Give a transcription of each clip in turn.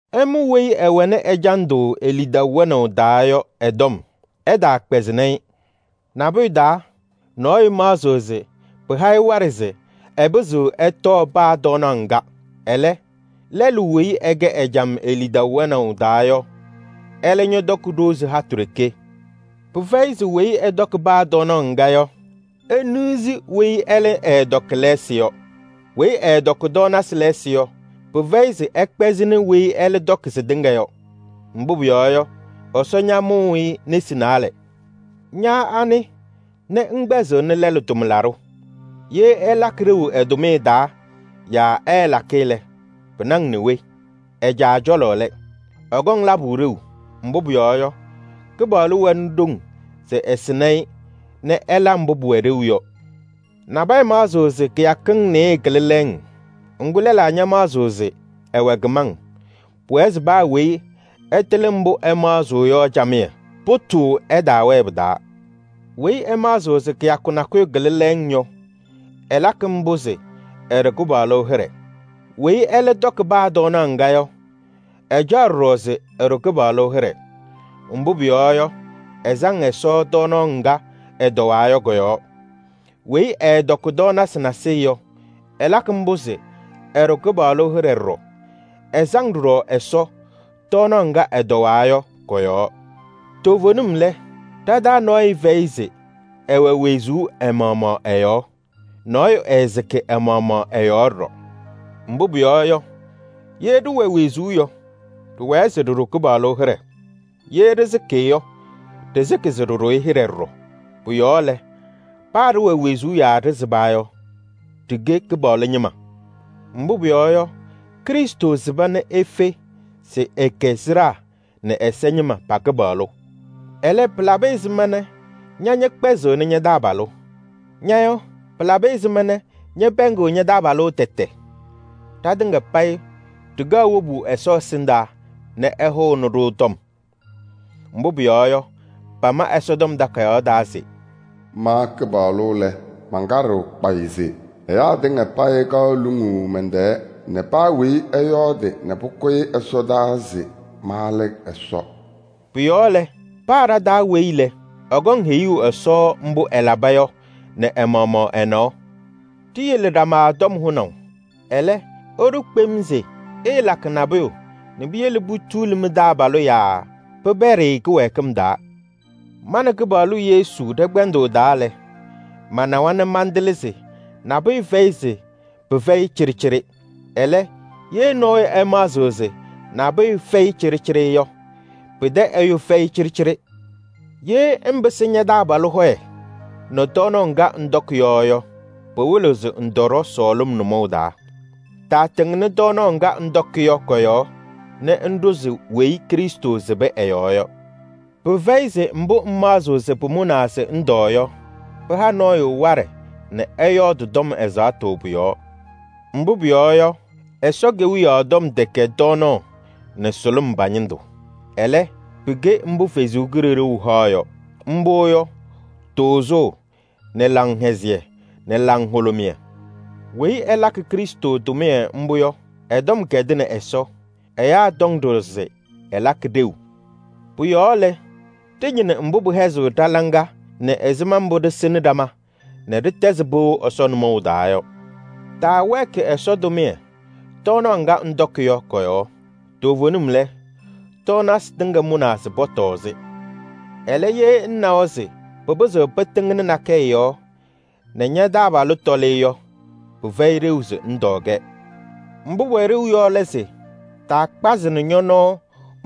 Ɩmʋ weyi ɛwɛnɩ ɛjandʋ e-lidaʋ wɛnaʋ taa yɔ ɛ-tɔm, ɩtaakpɛzɩnɩ-ɩ. Nabʋyʋ taa, nɔɔyʋ maɣzɩɣ se pɩha-ɩ waɖɛ se ɛpɩzɩɣ ɛtɔɔ paa tɔɔnaɣ ŋga. Ɛlɛ, lɛlʋ weyi ɛkɛ ɛjam e-lidaʋ wɛnaʋ taa yɔ, ɛlɛ ñɔtɔkɩ ɖozi hatʋ ɖeke. Pɩfɛyɩ se weyi ɛtɔkɩ paa tɔɔnaɣ ŋga yɔ, eniɣzi weyi ɛlɛ ɛɛtɔkɩ lɛɛsɩ yɔ. Weyi ɛɛtɔkɩ tɔɔnasɩ lɛɛsɩ yɔ, pɩfɛyɩ se ɛkpɛzɩnɩ weyi ɛlɛ tɔkɩ sɩtɩŋa yɔ. Mbʋ pʋyɔɔ yɔ, Ɛsɔ ñamʋ-ɩ nesi naalɛ. Ña anɩ nɛ ŋkpɛzɩɣnɩ lɛlʋ tʋmlaɖʋ? Ye ɛlakɩ ɖeu ɛ-tʋmɩyɛ taa yaa ɛɛlakɩ lɛ, pɩna-ŋ nɛ we? Ɛ-caa cɔlɔ lɛ. Ɛkɔŋ labʋ ɖeu, mbʋ pʋyɔɔ yɔ, Kɩpaɣlʋ wɛnɩ ɖoŋ se ɛsɩnɩ-ɩ nɛ ɛla mbʋ pʋwɛ ɖeu yɔ. Nabɛyɛ maɣzɩɣ se kɩyakɩŋ nɩɩyɩ kɩlɩ lɛɛŋ. Ŋgʋ, lɛlaa ñamaɣzɩɣ se ɛwɛ kɩmaŋ. Pʋwɛɛ se paa weyi ɛtɩlɩ mbʋ ɛmaɣzɩɣ yɔ camɩyɛ, pʋtʋʋ ɛtaawɛɛ pɩ-taa. Weyi ɛmaɣzɩɣ se kɩyakʋ nakʋyʋ kɩlɩ lɛɛŋ yɔ, ɛlakɩ mbʋ se ɛɖʋ Kɩpaɣlʋ hɩɖɛ. Weyi ɛlɛ tɔkɩ paa tɔɔnaɣ ŋga yɔ, ɛcaɣ ɖɔɖɔ se ɛɖʋ Kɩpaɣlʋ hɩɖɛ. Mbʋ pʋyɔɔ yɔ, ɛsaŋ Ɛsɔ tɔɔnaɣ ŋga ɛtɔwaa yɔ kɔ-yɔɔ. Weyi ɛɛtɔkɩ tɔɔnasɩ nasɩyɩ yɔ, ɛlakɩ mbʋ se ɛɖʋ Kɩpaɣlʋ hɩɖɛ ɖɔɖɔ. Ɛsaŋ ɖɔɖɔ Ɛsɔ tɔɔnaɣ ŋga ɛtɔwaa yɔ kɔ-yɔɔ. Toovenim lɛ, ɖa-taa nɔɔyʋ fɛyɩ se ɛwɛ wezuu ɛ-maɣmaɣ ɛ-yɔɔ. Nɔɔyʋ ɛɛsɩkɩ ɛ-maɣmaɣ ɛ-yɔɔ ɖɔɖɔ. Mbʋ pʋyɔɔ yɔ, ye ɖɩwɛ wezuu yɔ, ɖɩwɛɛ se ɖɩɖʋ Kɩpaɣlʋ hɩɖɛ. Ye ɖɩsɩkɩ yɔ, ɖɩsɩkɩ se ɖɩɖʋ-ɩ hɩɖɛ ɖɔɖɔ. Pʋ-yɔɔ lɛ, paa ɖɩwɛ wezuu yaa ɖɩsɩba yɔ, ɖɩkɛ Kɩpaɣlʋ ñɩma. Mbʋ pʋyɔɔ yɔ, Krɩstʋ sɩba nɛ efe se ɛkɛ sɩɖaa nɛ ɛza ñɩma pa-Kɩpaɣlʋ. Ɛlɛ, pɩlabɩ ɛzɩma nɛ ña ñɛkpɛzɩɣnɩ ña-taabalʋ? Ña yɔ, pɩlabɩ ɛzɩma nɛ ñɛpɛɛŋɩɣ ña-taabalʋ tɛtɛ? Ɖatɩŋa payɩ ɖɩkaɣ wobu Ɛsɔ ɛsɩndaa nɛ ɛhʋnɩ-ɖʋ tɔm. Mbʋ pʋyɔɔ yɔ, pama Ɛsɔtɔm Takayaɣ taa se: “Ma Kɩpaɣlʋ lɛ, mankaɖɩɣ kpayɩ se: ɛyaa tɩŋa payɩ kaɣ luŋuu mɛn-tɛɛ nɛ paa weyi ɛyɔɔdɩ nɛ pʋkʋyɩ ɛsɔdaa se ma lɛ Ɛsɔ.” Pʋ-yɔɔ lɛ, paa ɖa-taa weyi lɛ, ɛkɔŋ heyuu Ɛsɔ mbʋ ɛlaba yɔ nɛ ɛ-maɣmaɣ ɛ-nɔɔ. Ɖiyele ɖama tɔm hʋnaʋ. Ɛlɛ, ɩɖʋ kpem se: ɩɩlakɩ nabʋyʋ nɛ piyele putuuli mɩ-taabalʋ yaa pɩpɛɖɩ-ɩ kɩwɛɛkɩm taa. Ma nɛ Kɩpaɣlʋ Yesu ɖɛ-kpɛndʋʋ taa lɛ, manawa nɛ mantɩlɩ se nabʋyʋ fɛyɩ se pɩfɛyɩ cɩɖɩcɩɖɩ. Ɛlɛ, ye nɔɔyʋ ɛmaɣzɩɣ se nabʋyʋ fɛyɩ cɩɖɩcɩɖɩ yɔ, pɩtɛ ɛyʋ pɩfɛyɩ cɩɖɩcɩɖɩ. Ye ŋpɩsɩ ña-taabalʋ hɔyɛ nɛ tɔɔnaɣ ŋga ŋtɔkɩ yɔ yɔ, pɩwɩlɩɣ se ŋtɔɖɔ sɔɔlɩm nʋmɔʋ taa. Taatɩŋnɩ tɔɔnaɣ ŋga ŋtɔkɩ yɔ kɔ-yɔɔ nɛ ŋɖʋzɩ weyi Krɩstʋ sɩbɩ ɛ-yɔɔ yɔ. Pɩfɛyɩ se mbʋ ŋmaɣzɩɣ se pʋmʋnaa se ŋtɔɔ yɔ, pɩha nɔɔyʋ waɖɛ nɛ ɛyɔɔdɩ tɔm ɛzaɣtʋ pʋ-yɔɔ. Mbʋ pʋyɔɔ yɔ, Ɛsɔ Kewiyaɣ tɔm tɛkɛ tɔɔnaɣ nɛ sʋlʋm pa-ñɩndʋ. Ɛlɛ, pɩkɛ mbʋ Ɛsɔ Kalɩzaɣ haɣ yɔ. Mbʋ yɔ: tʋʋzʋʋ nɛ laŋhɛzɩyɛ nɛ laŋhʋlʋmɩyɛ. Weyi ɛlakɩ Krɩstʋ tʋmɩyɛ mbʋ yɔ, ɛ-tɔm kɛdɩnɩ Ɛsɔ. Ɛyaa tɔŋ ɖɔɖɔ se ɛlakɩ ɖeu. Pʋ-yɔɔ lɛ, ɖɩñɩnɩ mbʋ pɩhɛzɩɣ ɖa-laŋa nɛ ɛzɩma mbʋ ɖɩsɩnɩ ɖama nɛ ɖɩtɛzɩ pɩʋ Ɛsɔ nʋmɔʋ taa yɔ. Taawɛɛkɩ Ɛsɔ tʋmɩyɛ tɔɔnaɣ ŋga ŋtɔkɩ yɔ kɔ-yɔɔ. Toovenim lɛ, tɔɔnasɩ tɩŋa mʋnaa se pɔtɔɔ-sɩ. Ɛlɛ, ye ŋnawa se pɩpɩzɩɣ pɩtɩŋnɩ nakɛyɛ yɔɔ nɛ ña-taabalʋ tɔlɩ yɔ, pɩfɛyɩ ɖeu se ŋtɔɔ-kɛ. Mbʋ pʋwɛ ɖeu yɔ lɛ se: taakpazɩnɩ ñɔ-nɔɔ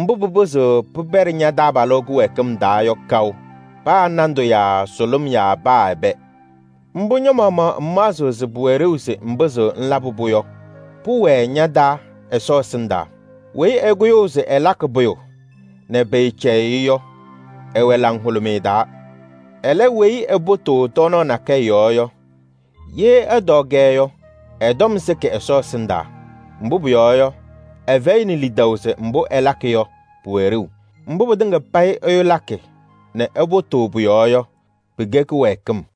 mbʋ pɩpɩzɩɣ pɩpɛɖɩ ña-taabalʋ kɩwɛɛkɩm taa yɔ kaʋ. Paa nandʋ yaa sʋlʋm yaa paa ɛbɛ. Mbʋ ña-maɣmaɣ ŋmaɣzɩɣ se pʋwɛ ɖeu se ŋpɩzɩɣ ŋlabɩ-pʋ yɔ, pʋwɛɛ ña-taa Ɛsɔ ɛsɩndaa. Weyi ɛkʋyʋʋ se ɛlakɩ pʋyʋ nɛ pɩɩcɛyɩɣ-ɩ yɔ, ɛwɛ laŋhʋlʋmɩyɛ taa. Ɛlɛ, weyi ɛpʋtʋʋ tɔɔnaɣ nakɛyɛ yɔɔ yɔ, ye ɛtɔɔ-kɛ yɔ, ɛ-tɔm sɩkɩ Ɛsɔ ɛsɩndaa. Mbʋ pʋyɔɔ yɔ, ɛfɛyɩnɩ lidaʋ se mbʋ ɛlakɩ yɔ pʋwɛ ɖeu. Mbʋ pɩtɩŋa payɩ ɛyʋ lakɩ nɛ ɛpʋtʋʋ pʋ-yɔɔ yɔ, pɩkɛ kɩwɛɛkɩm.